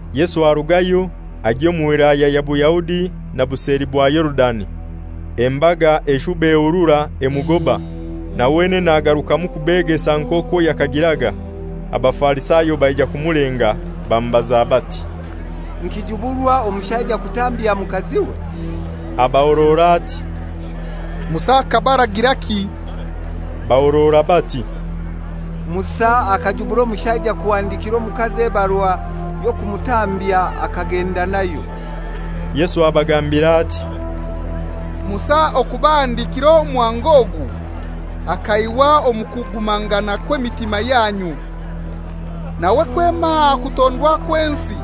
Yesu arugayo, agya omu Wilaya ya Buyahudi na buseli bwa Yorudani. Embaga eshuba ehurura emugoba, na wenene agarukamu kubegesa nk'okwo yakagiraga. Abafarisayo baija kumulenga, bamubaza bati, «Nikijuburwa omushaija kutambya mukaziwe?» Abahorora ati, «Musa akabaragiraki?» Bahorora bati, «Musa akajubura omushaija kuhandikira omukazi ebarua y'okumutambya akagenda nayo.» Yesu abagambira ati, «Musa okubahandikira omuhango ogu akaihwa omu kugumangana kw'emitima yanyu. Nawe kwema aha kutondwa kw'ensi,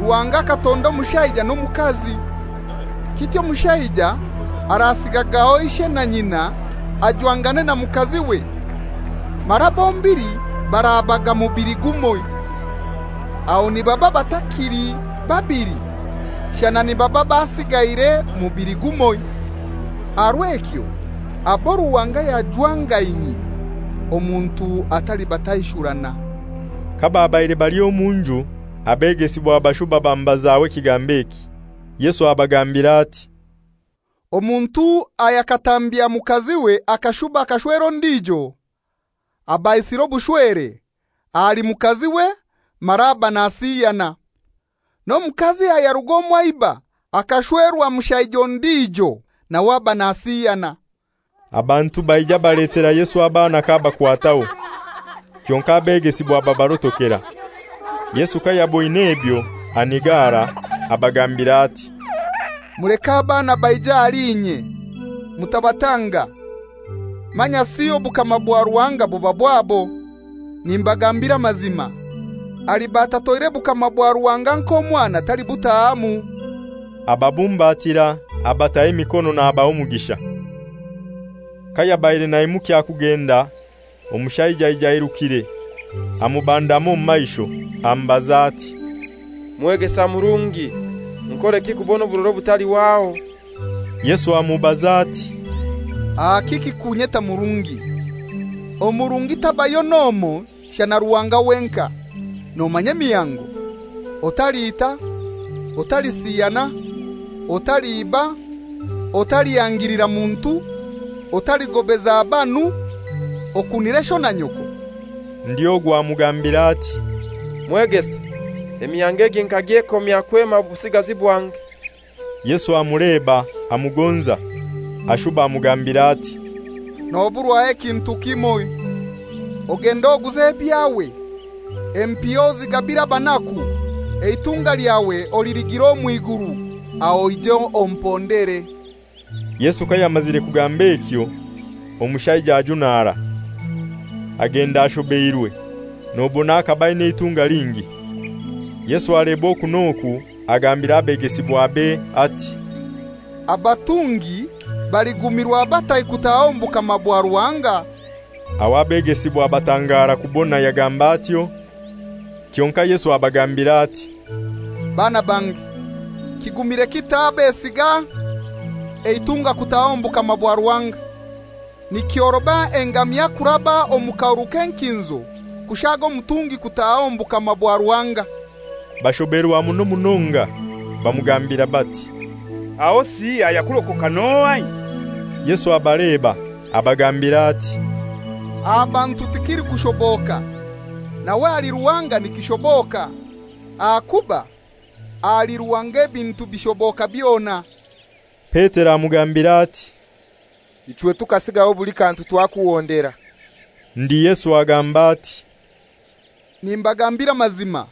Ruhanga akatonda omushaija n'omukazi. Kityo omushaija arasigagaho ishe na nyina ajwangane na mukaziwe, mara bombili barabaga mubili gumoi. Aho nibaba batakili babili shana nibaba basiigaire mubili gumoi. Aha rw'ekyo abo Ruhanga yajwangainyie, omuntu atalibataishurana.» Kababaire bali omu nju abegesibwa bashuba bamubazaho ekigambo eki. Yesu abagambira ati, «Omuntu ayakatambya mukaziwe akashuba akashwera ondijo, aba aisire obushwere ahali mukaziwe mara aba nasiyana. N'omukazi ayaruga omwa iba akashwerwa mushaija ondijo, nawe aba nasiyana.» Abantu baija baletera Yesu abaana k'abakwataho. Kyonkai abegesibwa babarotokera. Yesu kayaboin'ebyo anigara, abagambir'ati, «Muleke abaana baije ahali inye, mutabatanga; manyasi obukama bwa Ruhanga buba bwabo. Nimbagambira amazima, aliba atatoire bukama bwa Ruhanga nk'omwana talibutahamu.» Ababumbatira, abataho emikono nabaha omugisha. Kayabaire naimukya kugenda omushaija aija airukire amubandama omu maisho, amubaza ati, «Mwegesa murungi, nkoreki kubona oburora obutalihwaho?» Yesu amubaza ati, «Aha kiki kunyeta murungi? Omurungi tabayo n'omoi shana Ruhanga wenkai. Nomanya emihango: Otaliita, otalisiyana, otaliiba, otalihangilira muntu, otaligobeza banu, okunire sho na nyoko.» Ndi ogu amugambira ati, «Mwegesa, emihango egi nkagyekomya kwema obusigazi bwange.» Yesu amuleba amugonza, ashuba amugambira ati, «Noburwaho ekintu kimoi: Ogende oguze ebyawe, empiha ozigabire abanaku, eitunga lyawe oliligira omw'iguru; aho oije ompondere.» Yesu kayamazire kugamba ekyo omushaija ajunara, agenda ashobeirwe; nobona akaba aina eitunga lingi. Yesu aleba oku n'oku agambira abegesibwabe ati, «Abatungi baligumirwa batai kutaha omu bukama bwa Ruhanga!» Aho abegesibwa batangara kubona yagamba atyo. Kyonkai Yesu abagambira ati, «Baana bange, kigumire kitai abesiga eitunga kutaha omu bukama bwa Ruhanga! Nikyoroba engamia kuraba omu kahuru k'enkinzo kushaaga omutungi kutaha omu bukama bwa Ruhanga.» Bashoberwa muno munonga, bamugambira bati, «Ahosi ayakurokoka n'ohai?» Yesu abaleba, abagambira ati, «Aha bantu tikilikushoboka, nawe ahali Ruhanga nikishoboka; ahakuba ahali Ruhanga ebintu bishoboka byona.» Petero amugambira ati, «Ichwe tukasigaho buli kantu twakuhondera.» Ndi Yesu agamba ati, «Nimbagambira amazima,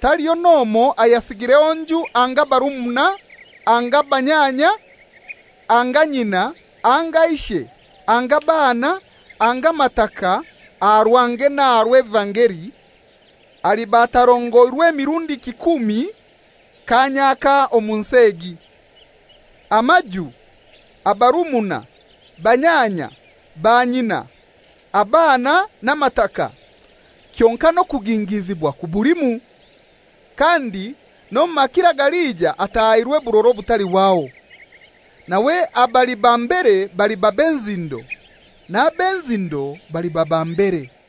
taliho n'omoi ayasigireho nju anga barumuna anga banyanya anga nyina anga ishe anga baana anga mataka aha rwange n'aha rw'evangeli, aliba atarongoirwe mirundi kikumi kaanya aka omu nsi egi, amaju, abarumuna, banyanya, banyina, abaana n'amataka, kyonkai n'okugingiizibwa kubulimu, kandi n'omu makiro agalija atahairwe burora obutalihwaho. Nawe abali ba mbere baliba b'enzindo, n'ab'enzindo baliba ba mbere.»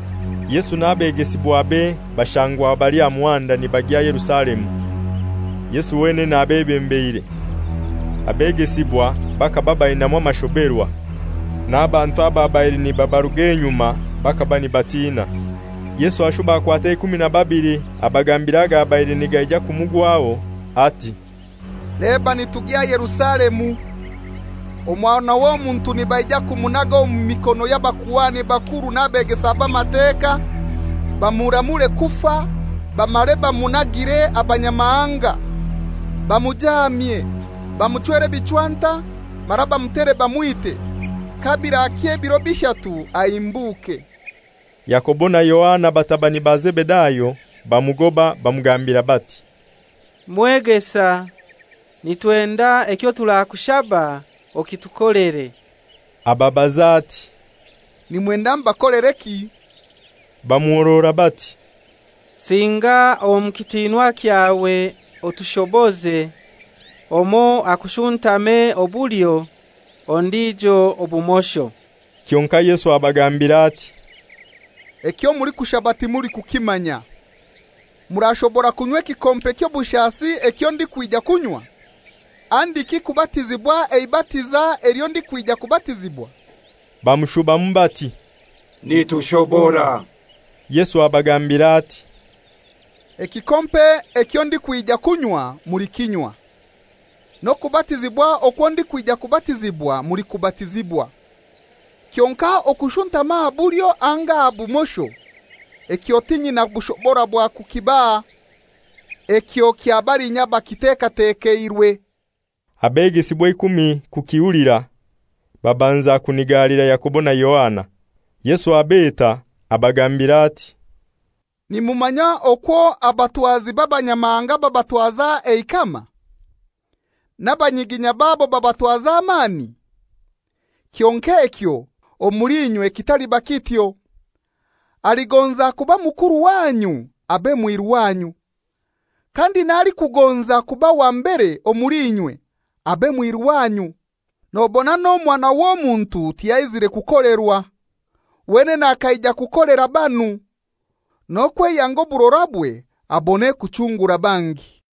Yesu n'abegesibwabe bashangwa bali aha muhanda nibagya Yerusalemu, Yesu wenene abebembeire. Abegesibwa bakaba bainamu amashoberwa, n'abantu ababaire nibabaruga enyuma bakaba nibatina. Yesu ashuba akwata eikumi na babili abagambira agabaire nigaija kumugwaho, ati, «Leba nitugya Yerusalemu. Omwana w'Omuntu nibaija kumunaga omu mikono y'abakuhani bakuru n'abegesa b'Amateka, bamuramure kufa bamare bamunagire Abanyamahanga; bamujaamye, bamuchwere ebichwanta, mara bamutere bamwite. Kabirakya ebiro bishatu ahimbuke.» Yakobo na Yohana batabani ba Zebedayo bamugoba bamugambira bati, «Mwegesa, nitwenda ekyoturakushaba okitukolere.» Ababaza ati, «Nimwenda mbakolereki?» Bamuhorora bati, «Singa omu kitinwa kyawe otushoboze: Omoi akushuntame obulyo, ondijo obumosho.» Kyonkai Yesu abagambira ati, «Ekyo mulikushaba timulikukimanya. Murashobora kunywa ekikompe ky'obushasi ekyo ndikwija kunywa, handiki kubatizibwa eibatiza elyo ndikwija kubatizibwa?» Bamushubamu bati, «Nitushobora.» Yesu abagambira ati, «Ekikompe ekyo ndikwija kunywa mulikinywa; n'okubatizibwa okwo ndikwija kubatizibwa mulikubatizibwa; kyonkai okushuntama aha bulyo anga aha bumosho, ekyo tinyina bushobora bwa kukibaha. Ekyo kya balinya abakitekatekeirwe.» Abegesibwa eikumi kukihulira, babanza kunigalira Yakobo na Yohana. Yesu abeta abagambira ati, «Nimumanya okwo abatwazi b'abanyamahanga babatwaza eikama, n'abanyiginya babo babatwaza amani. Kyonkai ekyo, omuli inywe kitaliba kityo. Aligonza kuba mukuru wanyu abe mwiru wanyu, kandi n'alikugonza kuba wa mbere omuli inywe, abe mwiru wanyu. Nobona n'Omwana w'Omuntu tiyaizire kukolerwa, wenene akaija kukolera banu, n'okweyanga oburorabwe abone kuchungura bangi.»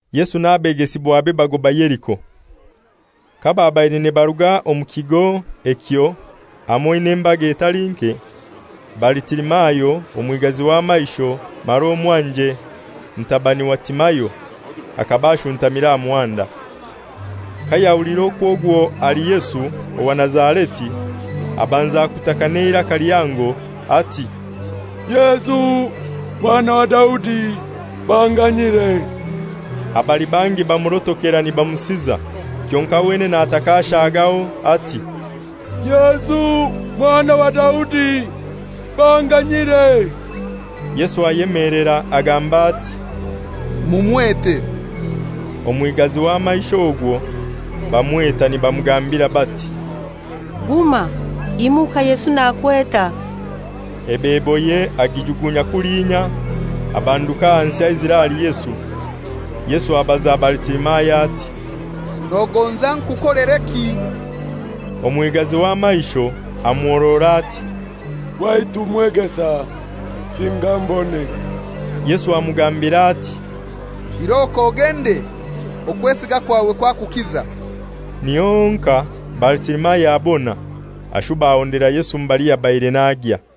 Yesu n'abegesibwabe bagoba Yeriko. Kababaire nibaruga omu kigo ekyo hamoi n'embaga etali nke, Baritimayo, omwigazi w'amaisho mara omwanje mutabani wa Timayo akaba ashuntamire aha muhanda. Kayahuliire okwo ogwo ali Yesu owa Nazareti, abanza kutaka n'eiraka lihango, ati, «Yesu Mwana wa Daudi, banganyire!» Abali bangi bamurotokera nibamusiza. Kyonkai wenene ataka ashagaho ati, «Yesu Mwana wa Daudi, banganyire!» Yesu ayemelera agamba ati, «Mumwete.» Omwigazi w'amaisho ogwo bamweta nibamugambira bati, «Guma, imuka, Yesu nakweta.» Ebeboye agijugunya kulinya, abanduka ahansi aizire ahali Yesu. Yesu abaza Baritimayo ati, «Nogonza nkukolereki?» Omwigazi w'amaisho amuhorora ati, «Waitu Mwegesa, singa mbone.» Yesu amugambira ati, «Iroko ogende, okwesiga kwawe kwakukiza.» Niho honkai Baritimayo abona, ashuba ahondera Yesu mbali yabaire nagya.